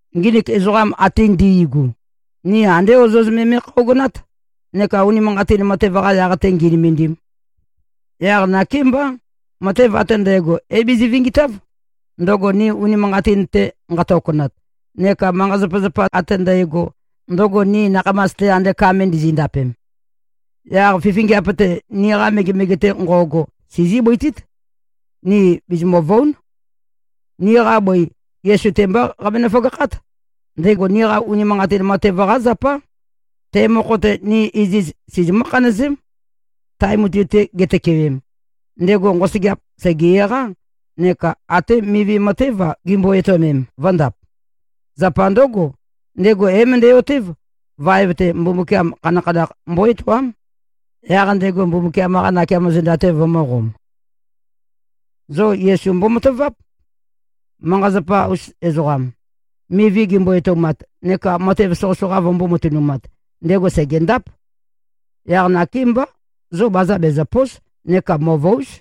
Nginik ezoqa ate ndi꞉gu, ni andé ozoz me me꞉khøogønát, neka unimanqatin matev-qa yaq-te ngī꞉nø̄mēndīm. Yaq nakémbá, matev ate ndægo é-bizi-vingitáv, ndøgo ni unimanqatin-te nqatokonat, neka manqa-zapazapa ate ndægo, ndøgo ni nakhamas-te ande ka me ndizi꞉-ndapem. Yaq fifingiap-te, niqa megemege-te nqo꞉go, sizí-bøitít. Ni bizimø̀-vøu᷄n. Niqa bøi, Yesu-te mbá qabenø-føgakhát. Ndego niqa unimanqatin matev-qá zapá. Te mokho-te, ni iziz sizimǿ-khanøzém. Tae mutui-te gitøkewem, ndego nqosøgeap sège-eqá, neka até mivi matév-a, gimbo-etøomem, vø̄ndap. Zapa ndǿgo, ndego é-møndæ-otév, vaev-te, Mbumbukiam khanakhanakh mbó-etoám. Yaq ndego Mbumbukiam-qa nakeamo zenda-te vømø̄qom. Zo Yesu mbomataváp. Manqa-zapa-us ezoqam, mivi gimbo-etoumat neka matev soqøsoqa vømbō-matønumat, ndego sègendáp. Yaq nakémbá, zo baza bezø̀po᷄s neka mø̀vøu᷄z.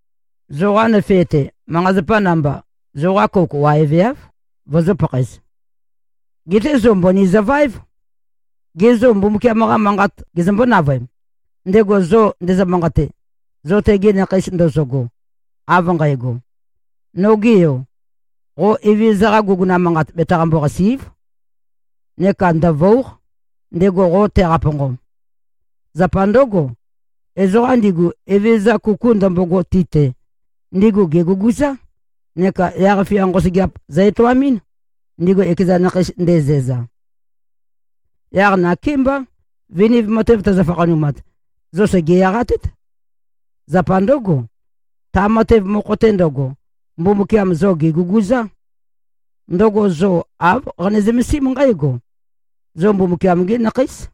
Zoqa nøfe-te, manqa-zapa namba, zoqa kouk waeveáv, vozō-pakhaez. Geté zo mbøni zøvaév. Gê, zo Mbumbukiam-qa manqat gezømbó-navøem, ndego zo ndezø-manqate, zo tegi nakheis ndozogo, av nqægo? “Noge yo, qo Evezøza-qa guguna manqat betaqambo-qàsi᷄꞉v. Neka ndø̀vøu᷄q, ndego qo teqaponqom. Zapa ndǿgo, ezoqa ndigu, Evezøza kuku ndømbogo ti-te, ndigu gèguguzá, neka yaq-fia nqosøgeap zø-etoamɨ́n, ndigu ekeza nakheis ndezæza.” Yaq nakémbá, viniv matev tøzø-fakhanumat, zo sège-eqatét. Zapa ndǿgo, ta matev mokho-te ndøgo, Mbumbukiam zo gèguguzá. Ndøgo zo āv qane-zømesím nqǽgo: Zo Mbumbukiam-gí nakheís.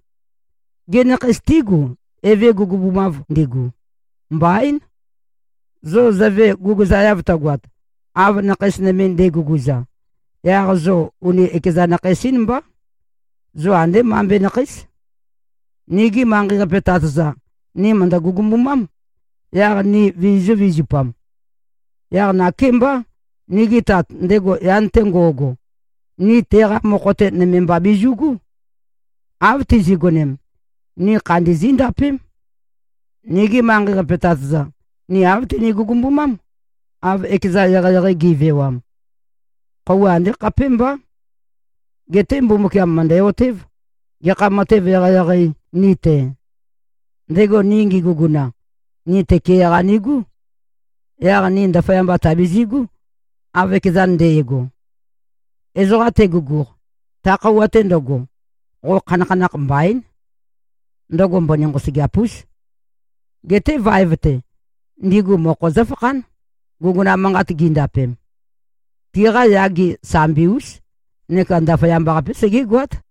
Gê, nakheis tígu, eve gugubumav ndigu? Mbaín. Zo zøve guguzaeav tøgoat, av nakheis nøme nde꞉guguza, yaq zo uni ekeza nakheis-ín mbá. Zo andé mambe nakheís. Nigi manqei-qape tat-za, ni mø̀ndø-gugumbumám, yaq ni vizizø̄-vizupam. Yaq nakémbá, nigi Tat, ndego yan-te ngo꞉go, ni teqa mokho-te, nøme mba bizu꞉gú. Av tizi꞉gonem, ni khandi zíndapém. Nigi manqei-qape tat-za, ni āv tini-gugumbumám, av ekezan eqeieqei gi꞉vewam. Khøuwa andé khapémbá. Geté Mbumbukiam mø̀ndæ-otév, gekha matev eqeieqei, ni-te. Ndego ni ngeguguna, ni tøke-qa nigú. Yaq ni ndaføyamba tàbizi꞉gú, av ekezan nde꞉go. Ezoqa teguguq, ta khøuwa-te ndøgo, qo khanakhanakh mbaín. Ndøgo mbøni nqosøgeap-ús. Geté vaev-te, ndigu mokho zǿfakhán, guguna manqat gindapem. Tiqa yage sambi-ús neka ndaføyamba-qapé segégoát.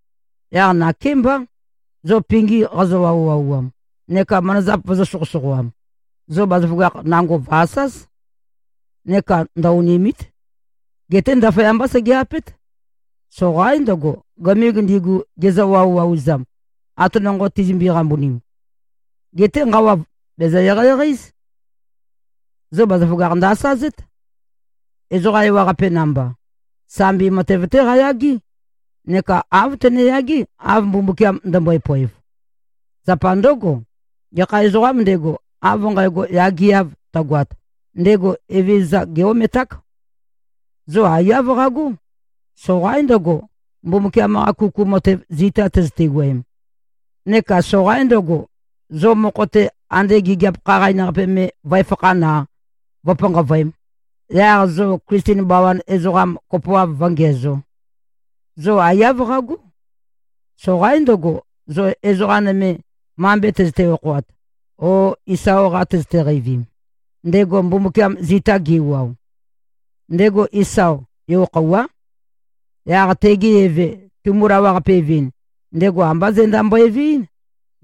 Yaq nakémbá, zo pingi qazø-wauwauam, neka manazap vøzø̄-soqøsoqoam, zo bazaføgakh nango, vø̀-asáz. Neka ndø-onìmi᷄t. Geté ndaføyambá sege-apét. Soqaín ndøgo, gømig ndigu, gizø-wauwau-ezam, ate nonqo tizømbe-qambunim. Geté nqawa bèzø-eqeieqei-éz. Zo bazaføgakh ndø-asazét. Ezoqa ewaqape namba, sambi matev-té qayagé, neka āv tøneyagé, av Mbumbukiam ndømbøe-poev. Zapa ndǿgo, gekha ezoqām ndego, av nqægo yageav tøgoat, ndego Evezøza gé-ometák. Zo aiyá qagó. Soqaín ndøgo, Mbumbukiam-qa kuku matev zita tøzøte-wuøem. Neka soqaín ndøgo, zo mokho-te, ande gigiap khaqain-qape me vǿefakhān-a, vǿpanqavøēm, yaq zo Klisten bawan ezoqam kopoav vǿngiæzō. Zo aiyá qagó. Soqaín ndøgo, zo ezoqa nøme, mambe tøzøte-okhoat o Isao-qa tøzøte-qeivim, ndego Mbumbukiam zita ge꞉wuao. Ndego Isao, yo-khøuwá. Yaq tege eve tumu-lawaqape-evɨn, ndego ambá zenda mbøeveɨ́n,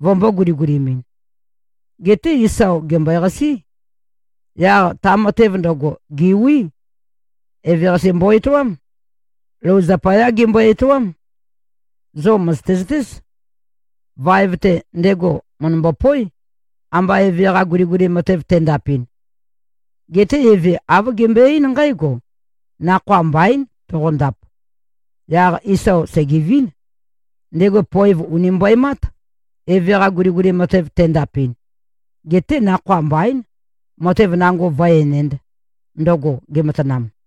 vømbō-guligulimɨn. Geté Isao gèmbøeqasí. Yaq ta matev ndøgo, gèwí. Eveqase mbo-etoám. Lou zapayá gembøe-etoám. Zo mø̀zøte-zøtéz. Vaev-te, ndego mø̀ndømbo-poé, amba eve-qa guliguli matev tendapɨn. Geté eve, āv gembøe-eín nqǽgo, “Nakhoa mbaín, toqondap.” Yaq Isao sègevín. Ndego poev ùni mbøemát, eve-qa guliguli matev tendapɨn. Geté nakhoa mbaín, matev nango vǿe-enēnd, ndøgo gematanam.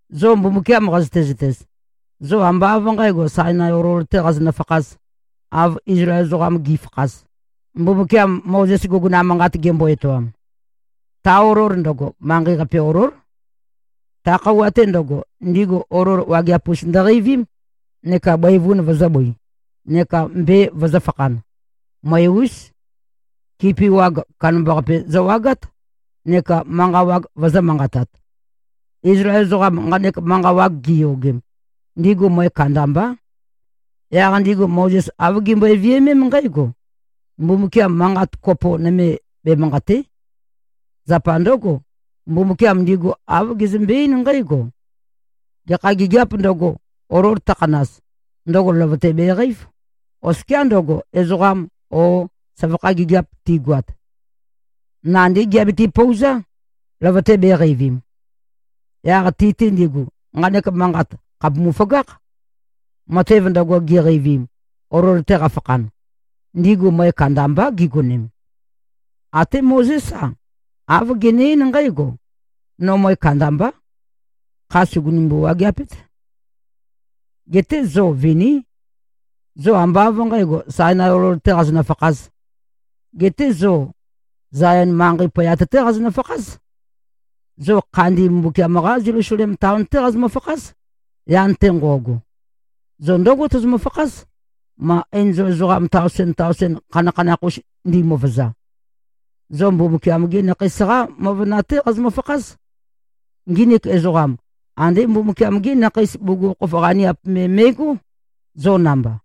Zo Mbumbukiam qazøte-zøtez, zo ambá av nqǣgo, Sainai olol-tē qazonø-fakhāz, av Izlael ezoqam gi꞉fakhaz, Mbumbukiam Mozes guguna manqat gembo-etoam. Ta olol ndøgo, manqei-qape olól. Ta khøuwa-te ndøgo, ndigu olol wageap-us ndøqeivím, neka bøivun vøzø̄-bøi, neka mbe vøzø̄fakhan. Møe-ús. Kipi wag kandambaqape zøwagát neka manqa wag vøzø̄-manqatat. Izlael ezoqam nqanek manqa wag giyogem, ndigu møe kandambá. Yaq ndigu Mozes āv gimbøe-viømém nqǽgo, “Mbumbukiam manqat kopo nøme bemanqàte᷄.” Zapa ndǿgo, Mbumbukiam ndigu āv gezømbe-eín nqǽgo, “Gekha gigiāp ndøgo, olol tøkhanaz, ndøgo løvøte beqeív, oskiá ndøgo, ezoqam o søvakha gigiap tigoat. Nandí giabiti-pouzá, løvøte bēqeivim.” Yaq ti-te ndigu, nqanek manqat khàpumu-føgákh. Matev ndøgo giqeivim, olol-te qafakhan, ndigu møe kandambá gigonem. Até Mozés-a, āv gene-eín nqǽgo, “No møe kandambá. Kha sùgunumbu-wageapét.” Geté zo viní. Zo ambá av nqǣgo, Sainai olol-tē qazonø-fakhāz. Geté zo Zayon manqei poyat-té qazonø-fakház. Zo khandi Mbumbukiam-qá Zelusalem taon-té qazomø-fakház, yan-te nqo꞉go. Zo ndǿgo tozomø-fakház, ma enzol ezoqam taosen-taosen, khanakhanakh-us ndimøvøza. Zo Mbumbukiam-gi nakheis-qá møvøna-té qazomø-fakház. Nginik ezoqam, andé Mbumbukiam-gí nakhei bugukhokhof qaniap me me꞉gó, zo namba.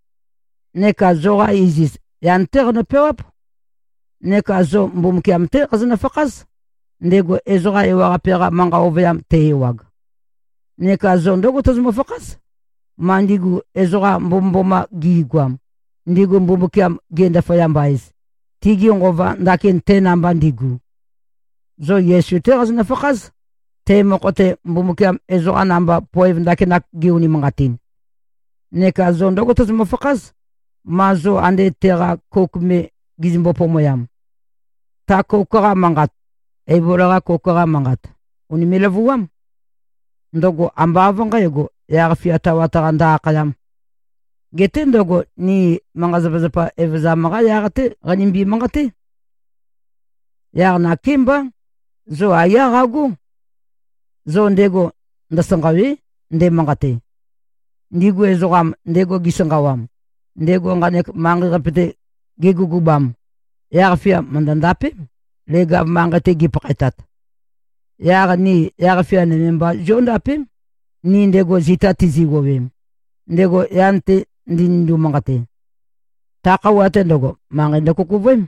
Neka zoqa iziz, yan-té qano-peawáp. Neka zo Mbumbukiam-té qazonø-fakház, ndego ezoqa ewaqape-qa manqa ovøyam te-ewag. Neka zo ndǿgo tozomø-fakház, ma ndigu ezoqa mbomømboma gi꞉goam, ndigu Mbumbukiam ge-ndaføyamba-ez, tigi nqova ndakin te namba ndigu. Zo Yesu-té qazonø-fakház, te mokho-te, Mbumbukiam ezoqa namba, poev ndakinak ge-unimanqatin. Neka zo ndǿgo tozomø-fakház, ma zo ande teqa kouk me gizømbo-pomoyam. Ta kouk-qa manqat, Eibol-qa kouk-qa manqat, ùnime꞉-løvuám. Ndøgo ambá av nqǣgo, yaq-fia tawat-qa ndø-akhayám. Geté ndøgo ni manqa-zapazapa evøzam-qa yaq-té qanimbi-manqaté. Yaq nakémbá, zo aiyá qagó. Zo ndego ndøsanqàwe᷄, ndemanqate. Ndigu ezoqam, ndego gisanqawam, ndego nqanek manqei-qape-te gegugubam, yaq-fia mø̀ndø-ndapém, leg-av manqei-te gipakhaetat. Yaq ni yaq-fia nøme mba zióndapém, ni ndego zita tizi꞉-wuowem, ndego yan-te ndenindo-manqate. Ta khøuwa-te ndøgo, manqei ndøkukuvøém,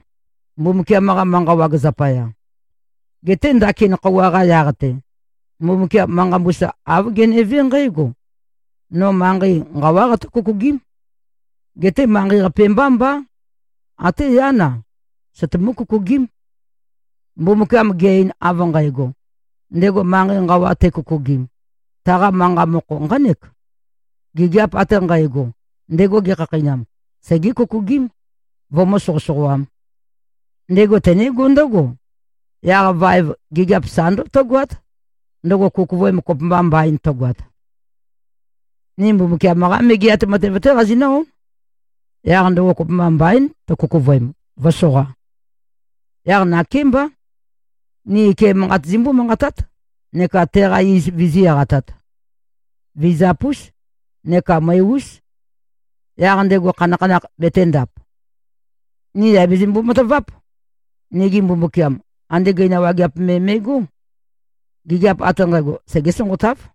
Mbumbukiam-qa manqa wag zapaya. Geté ndakin khøuwa-qa yaq-te, Mbumbukiam manqa mbusa āv genevé nqǽgo, “No manqei nqawá qatǿ-kukugím. Geté manqei-qape mbá mbá. Até yán-a, søtumú-kukugím.” Mbumbukiam ge-ein av nqægo, ndego manqei nqawa tekukugim, taqa manqa mokho nqánek: Gigiap ate nqægo, ndego gekhakheinam, segé-kukugím, vømǿ-soqøsoqoām. Ndego tenégó ndǿgo: Yaq vaev gigiap sa ndǿgo tǿgoát, ndøgo kukuvøem kopømba mbaín tøgoat. Ni Mbumbukiam-qá megeat matev-té qazinǿ-ón. Yaq ndøgo kopømba mbaín, tøkukuvøem, vǿsoqā. Yaq nakémbá. Ni ike manqat zimbó-manqatát, neka teqa iz vizí-eqatāt. Vizap-ús neka møe-ús. Yaq ndego khanakhanakh betēndap. Ni yà bizimbo-mataváp. Nigi Mbumbukiam andé gøina wageap me me꞉gó. Gigiap ate nqægo, segé-sonqotáv.